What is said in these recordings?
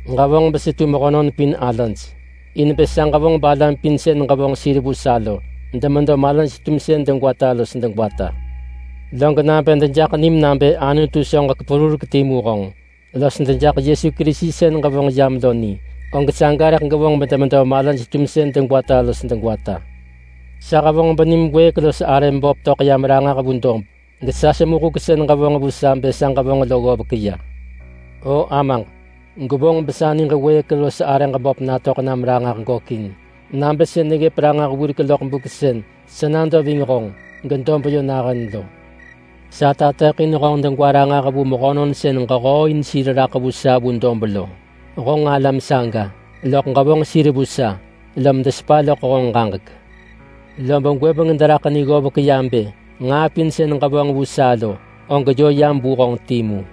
Ġevonġ besetu mehönon pin alaj in bë sa ġevonġ balam pin sën ġevonġ sir vu sa lo demedo malaj-tumsën degwata los degwata. Log nabë dejaḳ nim nabë Anutu anon perurek timu honġ, los dejaḳ Yesu Kerisi sën ġevonġ yam lo ni, og saga rëḳ gevonġ bedemedo malaj-tumsën degwata los degwata. Sa hevonġ benim wëëk los arëm böp töḳ yam ranġah vu dob, gesa semu huk sën ġevonġ vu sa bë sa ġevonġ lo ggovek ya. O Amaġ, gwevonġ besa niġ wëëk los arëġ böp natöḳ nam ranġah gökin nabë sën neggëp ranġah wirek loḳ buk sën sa nado ving honġ gedob yö nahën lo. Sa tateḳin honġ degwa ranġah vu mehönon sën ġehooin sir raḳ vu sa vu dob lo. Honġ alam saga, loḳ ġevonġ sir vu sa, lom desepa loḳ honġ ġaġek. Lob gwëbeng deraḳ ni ggovek ya bë nġaa pin sën ġevonġ vu sa lo, og yö yam vu honġ timu.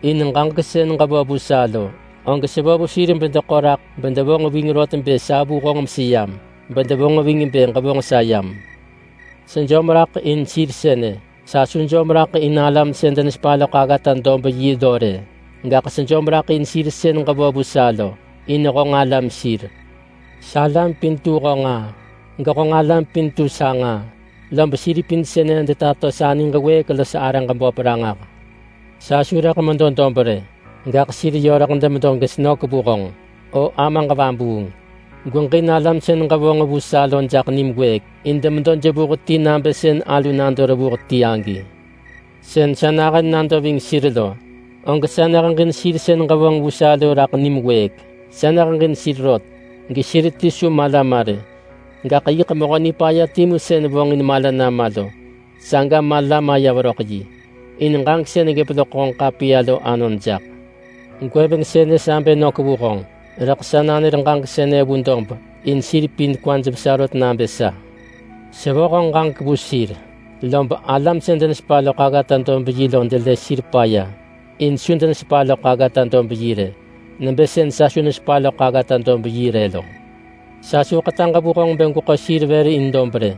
In ġaġek sën ġevo vu sa lo, og sevo vu sir bedeḳo raḳ bedevonġ ving rot bë sa vu honġ meseyam. Bedevonġ ving bë ġevonġ sa yam. Sejom raḳ in sir sënë. Sa su jom raḳ in alam sën denesepa loḳ aggata-dob-yi lo rë, gaḳ sejom raḳ in sir sën ġevo vu sa lo, in honġ alam sir. Salam pin tu honġ nġaa, gehonġ alam pin tu sa nġaa, lob sir pin sënë detato sa niġ wëëk los arëġ böp ranġah. Sa su rëḳ medo dob rë, gaḳ sir yö rëḳ demedo gesenök vu honġ. O Amaġ Vabuung! Gweġin alam sën ġevonġ vu sa lo jaḳ nim wëëk, in demedo jevuh ti nabë sën alu nado revuh ti agi. Sën sa nahën nado ving sir lo, og sa neheġin sir sën ġevonġ vu sa lo raḳ nim wëëk. Sa neheġin sir rot gesir ti su mala ma rë, gaḳ yiḳ mehö nipaya timu sën vonġin mala nama lo, saga mala maya veröḳ yi, in ġaġek sën neggëp loḳ honġ ḳapiya lo anon jaḳ. Gwëbeng sënë sa bë nök vu honġ, rëḳ sa nanër ġaġek sënë vu dob in sir pin kwaj vesa rot nabë sa. Sevo honġ ġaġek vu sir, lob alam sën denesepa loḳ aggata-dob-yi lo delë sir paya in su denesepa loḳ aggata-dob-yi rë nebë sën sa su nesepa loḳ aggata-dob-yi rë lo. Sa su ḳetaġ vu honġ bë gweḳo sir vër in dob rë,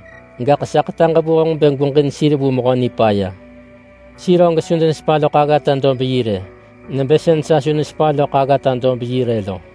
gaḳ sa ḳetaġ vu honġ bë gweġin sir vu Mehö Nipaya. Sir og su denesepa loḳ aggata-dob-yi rë, nebë sën sa su nesepa loḳ aggata-dob-yi rë lo.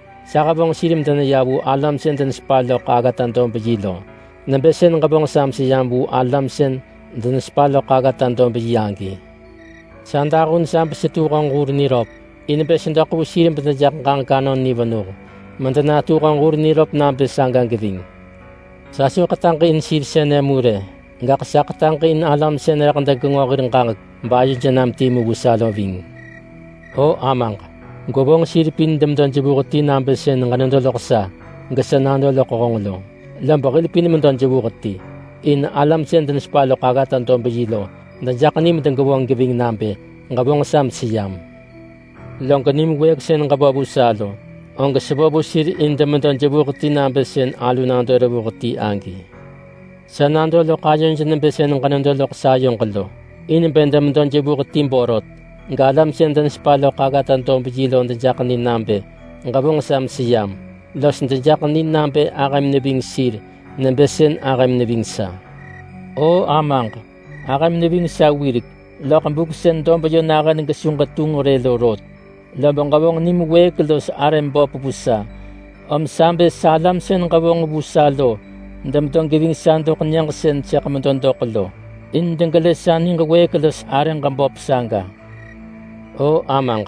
Sa hevonġ sir medeneya vu alam sën denesepa loḳ aggata-dob-yi lo, nebë sën ġevonġ sa meseyam vu alam sën denesepa loḳ aggata-dob-yi agi. Sa dahun sa besetu honġ hur niröp in bë sedoḳ vu sir bedejaḳ ġaġek anon ni venuh medenatu honġ hur niröp nabë saga geving. Sa su ḳetaġ in sir sënë mu rë, gaḳ sa ḳetaġ in alam sën rëḳ degenġo hir ġaġek bayoj nam timu vu sa lo ving. O Amaġ! Gwevonġ sir pin demedo jevuh ti nabë sën ġenedo loḳ sa, gesa nado loḳ honġ lo, lob hil pin medo jevuh ti, in alam sën denesepa loḳ aggata-dob-yi lo dejaḳ ni medegevonġ geving nabë ġevonġ sa meseyam. Log nim wëëk sën ġevo vu sa lo, og sevo vu sir in demedo jevuh ti nabë sën alu nado revuh ti agi. Sa nado loḳ ayoj nebë sën ġenedo loḳ sayoġ lo, in bë demedo jevuh ti borot, galam sën denesepa loḳ aggata-dob-yi lo dejaḳ ni nabë ġevonġ sa meseyam, los dejaḳ ni nabë ahëm neving sir nebë sën ahëm neving sa. O Amaġ! Ahëm neving sa wirek loḳ buk sën dob yö nahën gesu ġetunġ rë lo rot, lob ġevonġ nim wëëk los arëm böp vu sa, om sa bë salam sën ġevonġ vu sa lo demedo geving sa doḳ nyëġ sën sëḳ medo doḳ lo in degelë sa niġ wëëk los arëġ böp saga. O Amaġ,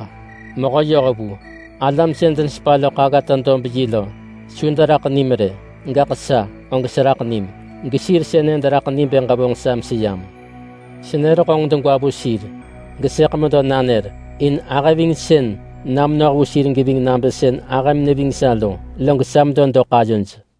Mehö yohvu! Alam sën denesepa loḳ aggata-dob-yi lo su deraḳ nim rë, gaḳ sa og seraḳ nim gesir sënë deraḳ ni bë ġevonġ sa meseyam. Senër honġ degwa vu sir, gesëḳ medo nanër. In ahëvingsën na menoh vu sir geving nabë sën ahëm neving sa lo, log sa medo doḳ ayoj.”